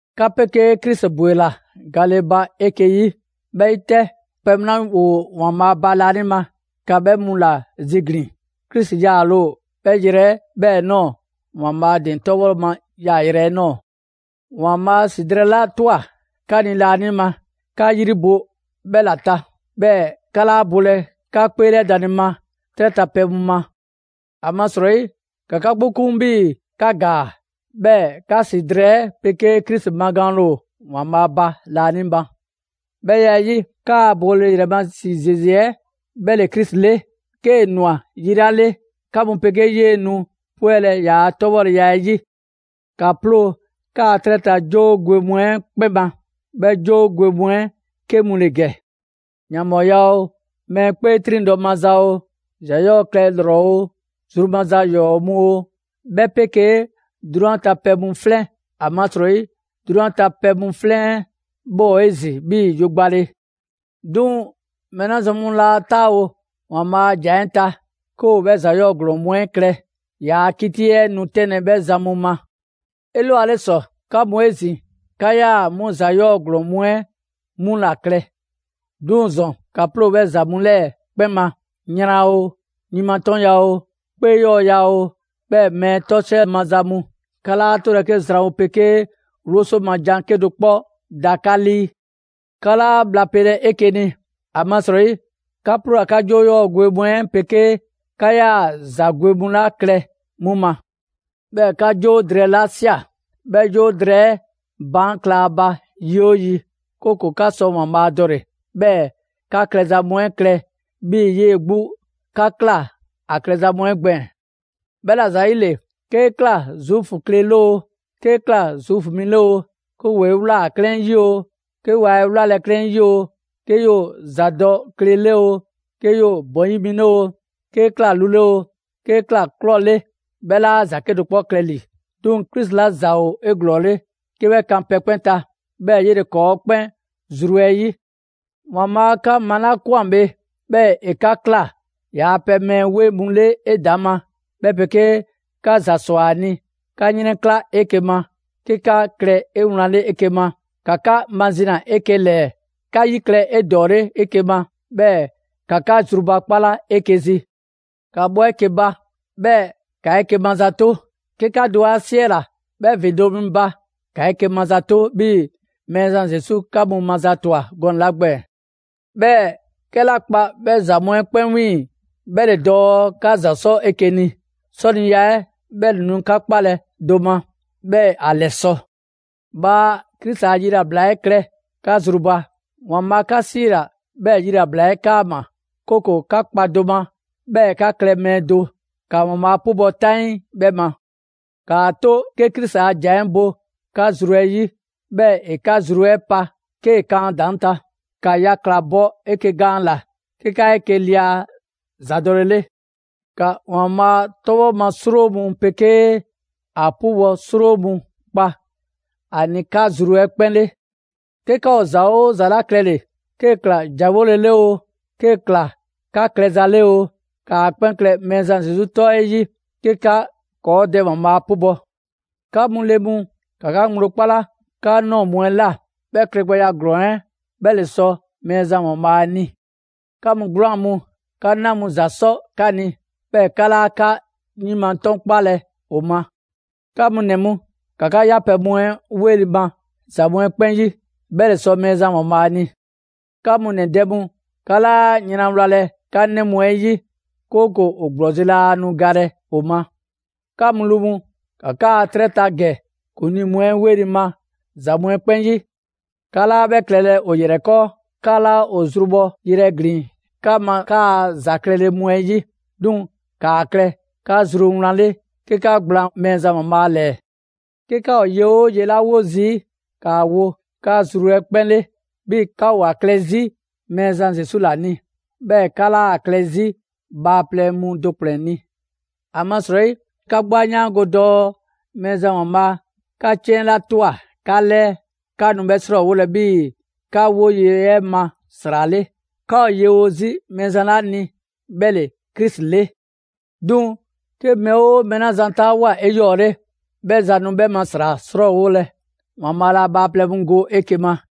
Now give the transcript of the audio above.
'Ka 'pegee Krisi ‑bwela gale ba 'eke‑ 'yi. 'Bhɛ 'yi 'tɛ, pɛ mu 'la ‑woo ‑Waanbhaa' ba laanima, ‑ka 'bhɛ mu ‑la ziglin‑; Krisi 'yaale‑ ‑o 'bhɛ yrɛ 'ɛ 'bhɛɛ‑ ꞊nɔɔ, ‑Waanbhaa' ‑din 'tɔbhɔ ma yaayrɛ 'ɛ ꞊nɔɔ. ‑Waanbhaa' ‑si drɛɛ 'la ꞊twa 'ka ni laanima, 'ka 'yri bo 'bhɛ ‑la ta, 'bhɛɛ‑ 'ka 'laa bolɛ 'ka 'kpeelɛdanle ma 'trɛ ta pɛ mu ma. ‑Amasrɔyi, ‑ka 'ka 'gbu 'kun 'bhii‑ ka ‑gaa. 'Bhɛɛ‑ 'ka 'si drɛɛ 'ɛ pegee Krisi magaanle ‑o ‑Waanbhaa' ba laanima. 'Bhɛ ya 'ɛ 'yi, 'kaa‑ bole ‑yrɛ ma ‑si ‑zeze 'ɛ 'bhɛ ‑le Krisi 'le; 'kee‑ ꞊nwa yi 'la 'le, 'ka mu 'pegee 'yee‑ nu 'pwɛlɛ‑ ‑yaa' 'tɔbhɔleya 'ɛ 'yi. ‑Ka 'ploo‑ 'kaa 'trɛ ta 'joo gwe mu 'ɛ 'kpɛn ma; 'bhɛ 'joo gwe mu 'ɛ 'ke mu ‑le ‑gɛ: ‑yanbhɔɔya oo, mɛɛ 'kpee 'triŋdɔ‑ maza oo, ‑za 'yɔɔ‑ klɛ ‑lrɔ oo, zru maza ‑yɔɔ' mu oo, 'bhɛ 'pegee 'drunyan ta pɛ mu 'flɛn, ‑amasrɔyi 'drunyan ta pɛ mu 'flɛn 'ɛ 'bhɛ ‑o 'ezin‑ 'bhii‑ yogbale. 'Duŋ‑ mɛɛ 'la zan mu laa 'taawo ‑Waanbhaa' a ‑jan 'ɛ ta, 'ke ‑o 'bhɛ ‑za 'yɔɔ‑ ‑glɔɔn mu 'ɛ klɛ, ‑yaa' 'kiti 'ɛ nu 'tɛnlɛ‑ 'bhɛ zan mu ma. 'Elwale ‑sɔ, 'ka mu 'ezin‑, 'ka 'yaa‑ 'mu ‑za 'yɔɔ‑ ‑glɔɔn mu 'ɛ 'mu ‑la klɛ. 'Duŋ‑ ‑zɔn, ‑ka 'ploo‑ 'bhɛ ‑za mu 'lɛɛ‑ 'kpɛn ma: yran oo, yin ma 'tɔnya‑ oo, 'kpee 'yɔɔya‑ oo, 'bhɛɛ‑ mɛɛ 'tɔsiɛ maza mu. 'Ka 'laa 'tolɛ‑ 'ke ‑zwanwo' 'pegee 'wloso ma jan 'kedo‑ 'kpɔ da 'ka 'lii. 'Ka 'laa bhla pelɛ 'eke‑ ni, ‑amasrɔyi 'ka 'ploola‑ 'ka 'joo 'yɔɔ‑ gwe mu 'ɛ 'pegee 'ka ‑yaa ‑za gwe mu 'la klɛ 'mu ma. 'Bhɛɛ‑ 'ka 'joo drɛɛ ‑la ꞊sia. 'Bhɛɛ‑ 'joo drɛɛ 'ɛ baan' kla ‑a ba yi 'oo yi, 'kooko‑ 'ka sɔ ‑Waanbhaa' dɔle‑, 'bhɛɛ‑ 'ka klɛza mu 'ɛ klɛ 'bhii‑ 'yee‑ 'gbu 'la 'ka ꞊kla ‑a klɛza mu 'ɛ gbɛɛn‑. 'Bhɛla‑ ‑zayile, 'kee ꞊kla Zuufu kle 'le oo, 'kee ꞊kla Zuufu mi 'le oo, 'ke ‑woo 'e ꞊wlaa 'klɛɛn 'yi oo, 'ke waa 'e 'wlalɛ‑ 'klɛɛn 'yi oo, 'kee 'yoo‑ ‑zadɔkle 'le oo, 'kee 'yoo‑ ‑bɔn 'yi mi 'le oo, 'kee ꞊kla lu 'le oo, 'kee ꞊kla ꞊klɔ 'le, 'bhɛ 'laa ‑za 'ke klɛ ‑li. 'Duŋ‑ Krisi ‑la ‑za ‑o 'eglɔɔle 'ke 'bhɛ kan pɛ 'kpɛn ta. 'Bhɛɛ‑ 'yele‑ ‑kɔɔ' 'kpɛn zru 'ɛ 'yi. ‑Waanbhaa' 'ka malakwan bhe, 'bhɛɛ‑ ‑e 'ka ꞊kla ‑yaa' pɛ mɛɛ 'weŋ mu 'le 'edaŋma, 'bhɛ 'pegee 'ka ‑za ꞊swa ‑a ni, 'ka 'yrɛnkla 'eke‑ ma, 'ke 'ka klɛ 'ewlanle 'eke‑ ma, ‑ka 'ka mazina 'eke‑ ‑lɛɛ, 'ka 'yi klɛ 'edɔɔle 'eke‑ ma, 'bhɛɛ‑ ‑ka 'ka zrubakpala 'eke‑ zi. ‑Ka bhɔ 'eke‑ ba; 'bhɛɛ‑ ‑ka 'eke‑ mazato. 'Ke 'ka do 'a ‑siɛla 'bhɛ ‑vindo' mi ba, ‑ka 'eke‑ mazato, 'bhii‑ Mɛɛzan Zesu 'ka mu mazatwa gɔnɛ‑ 'la gbɛɛn‑. 'Bhɛɛ‑ 'kɛla kpa 'bhɛ ‑za mu 'ɛ 'kpɛn 'wiiŋ‑, 'bhɛ ‑le dɔɔ 'ka ‑za 'sɔ 'eke‑ ni, 'sɔniya 'ɛ 'bhɛ ‑le nu 'ka 'kpalɛ‑ do ma, 'bhɛɛ‑ ‑a 'lɛsɔ‑. Bhaa Krisi a yilabla 'ɛ klɛ 'ka zru ba. ‑Waanbhaa' 'ka 'siila‑ 'bhɛɛ‑ yilabla 'ɛ 'kaama‑, 'kooko‑ 'ka kpa do ma, 'bhɛɛ‑ 'ka klɛ mɛɛ do. ‑Ka ‑Waanbhaa' 'pubɔ‑ 'taŋii 'bhɛ ma. ‑Kaa 'to 'ke Krisi a ‑jan 'ɛ bo 'ka zru 'ɛ 'yi, 'bhɛɛ‑ ‑e 'ka zru 'ɛ pa 'kee‑ kan ‑a ‑daŋ' ta. ‑Ka yakla‑ bɔ 'eke‑ gaan ‑la, 'ke 'ka 'eke‑ lia ‑zadɔlele. ‑Ka ‑Waanbhaa' 'tɔbhɔ ma 'sro mu 'pegee ‑a 'pubɔ‑ 'sro mu 'kpa ‑a ni 'ka zru 'ɛ 'kpɛn 'le. 'Ke 'ka ‑o ‑za 'oo ‑za 'la klɛle‑, 'kee‑ ꞊kla ‑janwole 'le oo, 'kee‑ ꞊kla 'ka klɛza 'le oo, ‑kaa 'kpɛn klɛ Mɛɛzan Zesu 'tɔ 'ɛ 'yi, 'ke 'ka ‑kɔɔ' Dɛ ‑Waanbhaa' 'pubɔ‑. 'Ka mu le mu, ‑ka 'ka ŋgblo 'kpala 'ka ꞊nɔɔ mu 'ɛ ꞊la. 'Bhɛ klɛgbɛya ‑glɔɔn 'ɛ, 'bhɛ ‑le sɔ Mɛɛzan ‑Waanbhaa' ni. 'Ka mu 'gwlaan‑ mu, 'ka 'na mu ‑za 'sɔ 'ka ni, 'bhɛɛ‑ 'ka 'laa 'ka yin ma 'tɔnkpalɛ ‑o ma. 'Ka mu ‑nɛ mu, ‑ka 'ka 'yapɛ‑ mu 'ɛ 'weli‑ ma ‑za mu 'ɛ 'kpɛn 'yi. 'Bhɛ ‑le sɔ Mɛɛzan ‑Waanbhaa' ni. 'Ka mu ‑nɛ dɛ mu, 'ka 'laa yran wlalɛ 'ka 'nɛ mu 'ɛ 'yi, 'kooko‑ ‑o ‑gblɔzi' laa nu galɛ ‑o ma. 'Ka mu lu mu, ‑ka 'kaa‑ 'trɛ ta ‑gɛ ‑kuŋlii mu 'ɛ 'weli‑ ma ‑za mu 'ɛ 'kpɛn 'yi. 'Ka 'laa 'bhɛ klɛlɛ ‑o ‑yrɛ 'kɔɔ, 'ka 'laa ‑o zrubhɔ yrɛ ‑glinlɛ' 'ka ma 'kaa‑ ‑za klɛle mu 'ɛ 'yi. 'Duŋ‑ ‑kaa klɛ 'ka zru wlan 'le, 'ke 'ka gblaan Mɛɛzan ‑Waanbhaa' ‑lɛɛ. 'Ke 'ka ‑o ye 'oo ye 'la 'wo zii', ‑kaa wo 'ka zru 'ɛ 'kpɛn 'le; 'bhii‑ 'ka ‑o ‑a klɛ 'zi Mɛɛzan Zesu ‑la ni; 'bhɛɛ‑ 'ka 'laa‑ klɛ 'zi bhaaplɛŋ mu do ‑kplɛn ni. ‑Amasrɔyi 'ka 'gbu 'a 'yaango dɔɔ Mɛɛzan ‑Waanbhaa' 'ka 'ciɛn 'la ꞊twa 'ka 'lɛɛ, 'ka nu 'bhɛ 'srɔɔwolɛ 'bhii‑ 'ka 'woye‑ 'ɛ ma ‑sra 'le. 'Ka ‑o yewo 'zi Mɛɛzan 'la ni 'bhɛ ‑le Krisi 'le. 'Duŋ‑ 'ke mɛɛ 'oo mɛɛ 'la zan 'taawoa꞊ 'eyɔɔle, 'bhɛ zan nu 'bhɛ ma ‑sra 'srɔɔwolɛ. ‑Waanbhaa' laa bhaaplɛŋ mu go 'eke‑ ma.